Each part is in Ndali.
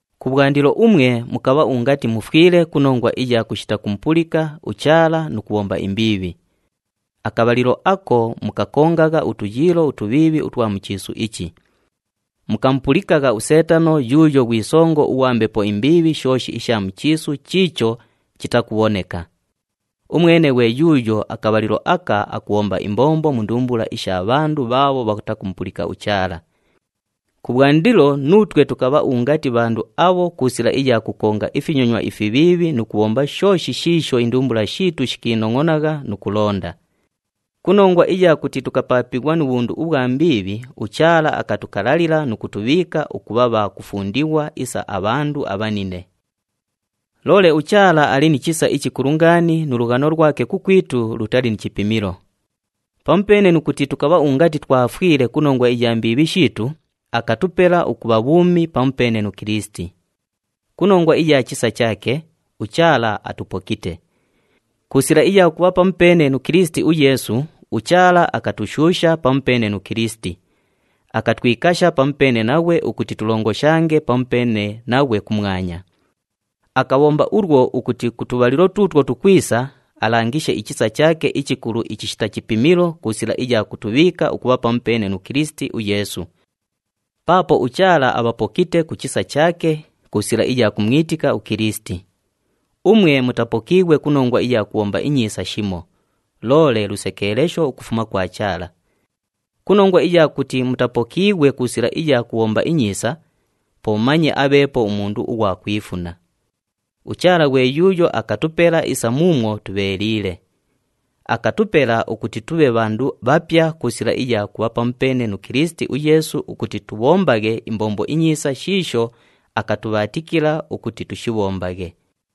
Kubhwandilo umwe mukabha ungati mufwile ku nongwa iya kushita kumupulika uChaala nu kubhomba imbiibhi. Akabhalilo ako mukakongagha utuyiilo utubhiibhi utwa mu chiisu ichi. Mukamupulikagha uSeetano yuuyo ghwi songo ughwa mbepo imbiibhi shooshi isha mu chiisu chiicho chitakubhoneka. Umwene ghwe yuuyo akabhalilo aka akubhomba imbombo mu ndumbula isha bhandu bhaabho bhatakumupulika uChaala. Kubhwandilo nuutwe tukabha ungati bhandu abho ku sila iya kukonga ifinyonywa ifibhiibhi nu kubhomba shooshi shiisho indumbula shiitu shikiinongʼonagha nu kulonda. Ku nongwa iya kuti tukapaapighwa nu bhundu ubhwa mbiibhi, uChaala akatukalalila nu kutubhiika ukubha bha kufundighwa isa abhandu abhanine. Loole uChaala ali ni chisa ichikulu ngaani nu lughano lwake kukwitu lutali ni chipimilo. Pamupeene nu kuti tukabha ungati twafwile ku nongwa iya mbiibhi shiitu, akatupela ukubha bhuumi pamupeene nu Kilisiti. Ku nongwa iya chisa chaake, uChaala atupokite. Ku sila iya kubha pamupeene nu Kilisiti uYeesu, uChaala akatushuusha pamupeene nu Kilisiti, akatwikasha pamupeene naghwe ukuti tulongoshange pamupeene naghwe kumwanya. Akabhomba ulwo ukuti ku tubhalilo tuutwo tukwisa, alangishe ichisa chaake ichikulu ichishita chipimilo ku sila iya kutubhiika ukubha pamupeene nu Kilisiti uYeesu. Paapo uChaala abhapokite ku chisa chaake ku sila iya kumwitika uKilisiti. Umwe mutapokiighwe ku nongwa iya kubhomba inyiisa shimo, loole lusekeelesho ukufuma kwa Chaala. Ku nongwa iya kuti mutapokiighwe ku sila iya kubhomba inyiisa, po manye abheepo umundu ughwa kwifuna. UChaala ghwe yuuyo akatupela isa muumwo tubheeliile. Akatupela ukuti tubhe bhandu bhapya ku sila iya kubha pamupeene nu Kilisiti uYeesu ukuti tubhombaghe imbombo inyiisa shiisho akatubhaatikila ukuti tushibhombaghe.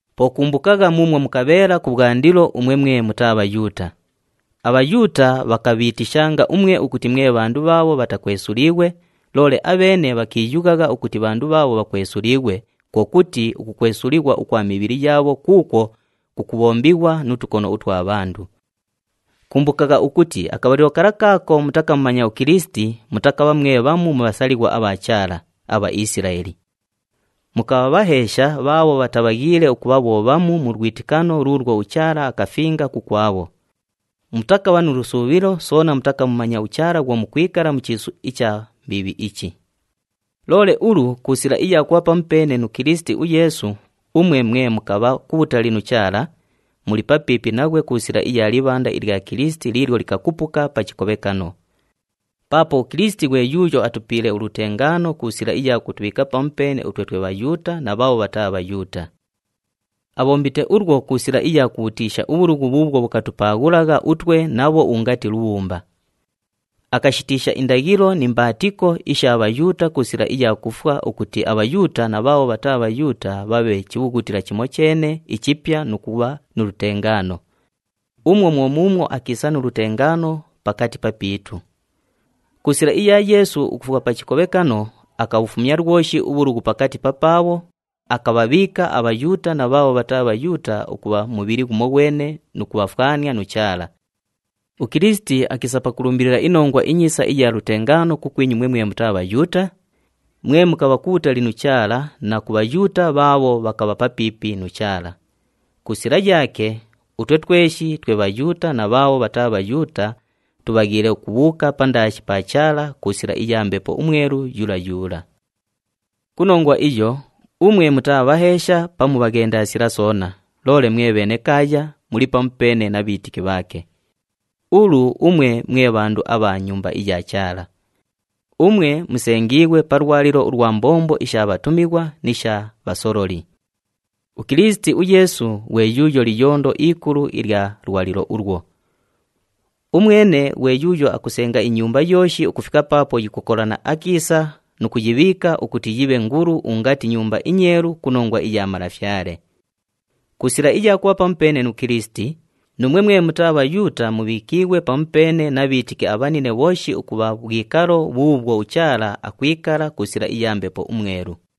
Po kumbukagha muumwo mukabheela kubhwandilo umwe mwe mutaa Bhayuuta. ABhayuuta bhakabhiitishanga umwe ukuti mwe bhandu bhaabho bhatakwesuliighwe, loole abheene bhakiiyughagha ukuti bhandu bhaabho bhakwesuliighwe, kwo kuti ukukwesulighwa ukwa mibhili yaabho kuukwo kukubhombighwa nu tukono utwa bhandu. Kumbukagha ukuti akabhalilo kala kaako mutakamumanya uKilisiti, mutakabha mwe bhamu mu bhasalighwa abha Chaala, aBhaisilaeli. Mukabha bhaheesha bhaabho bhatabhaghiile ukubha bho bhamu mu lwitikano luulwo uChaala akafinga kukwabho. Mutakabha nu lusuubhilo, soona mutakamumanya uChaala bhwo mukwikala mu chiisu icha mbiibhi ichi. Loole ulu, ku sila iya kubha pamupeene nu Kilisiti uYeesu, umwe mwe mukabha kubhutali nu Chaala, muli papiipi naghwe ku sila iya libhanda ilya Kilisiti liilyo likakupuka pa chikobhekano. Paapo uKilisiti ghwe yuuyo atupiile ulutengaano ku sila iya kutubhiika pamupeene utwe twe Bhayuuta na bhaabho bhataa Bhayuuta. Abhombite ulwo ku sila iya kubhutiisha ubhulughu bhuubhwo bhukatupaaghulagha utwe nabho ungati lubhumba. Akashitiisha indaghilo ni mbaatiko isha Bhayuuta ku sila iya kufwa ukuti aBhayuuta na bhaabho bhataa Bhayuuta bhabhe chibhughutila chimocheene ichipya nu kubha nu lutengaano. Umwo mwo muumwo akiisa nu lutengaano pakati papiitu. Ku sila iya Yeesu ukufwa pa chikobhekano, akabhufumya lwoshi ubhulughu pakati papaabho, akabhabhiika aBhayuuta na bhaabho bhataa Bhayuuta ukubha mubhili ghumoghwene nu kubhafwania nu Chaala. UKilisiti akiisa pakulumbilila iNongwa iNyiisa iya lutengaano kukwinyu umwe mwe mutaa Bhayuuta, mwe mukabha kubhutali nu Chaala na ku Bhayuuta bhaabho bhakabha papiipi nu Chaala. Ku sila yaake, utwe tweshi twe Bhayuuta na bhaabho bhataa Bhayuuta tubhaghiile ukubhuuka pandaashi pa Chaala ku sila iya Mbepo uMwelu yula yula. Ku nongwa iyo, umwe mutaa bhaheesha pamu bhaghendasila soona, loole mwe bhenekaaya, muli pamupeene na bhiitiki bhaake. Ulu umwe mwe bhandu abha mu Nyumba iya Chaala. Umwe musengiighwe pa lwalilo ulwa mbombo isha bhatumighwa ni sha bhasololi. UKilisiti uYeesu ghwe yuuyo liyondo ikulu ilya lwalilo ulwo. Umwene ghwe yuuyo akusenga inyumba yooshi ukufika paapo yikukolana akiisa nu kuyibhiika ukuti yibhe ngulu ungati nyumba inyeelu ku nongwa iya Malafyale. Ku sila iya kubha pamupeene nu Kilisiti, nuumwe mwe mutaa Bhayuuta mubhiikiighwe pamupeene na bhiitiki abhanine bhooshi ukubha bhwikalo bhuubhwo uChaala akwikala ku sila iya Mbepo uMwelu.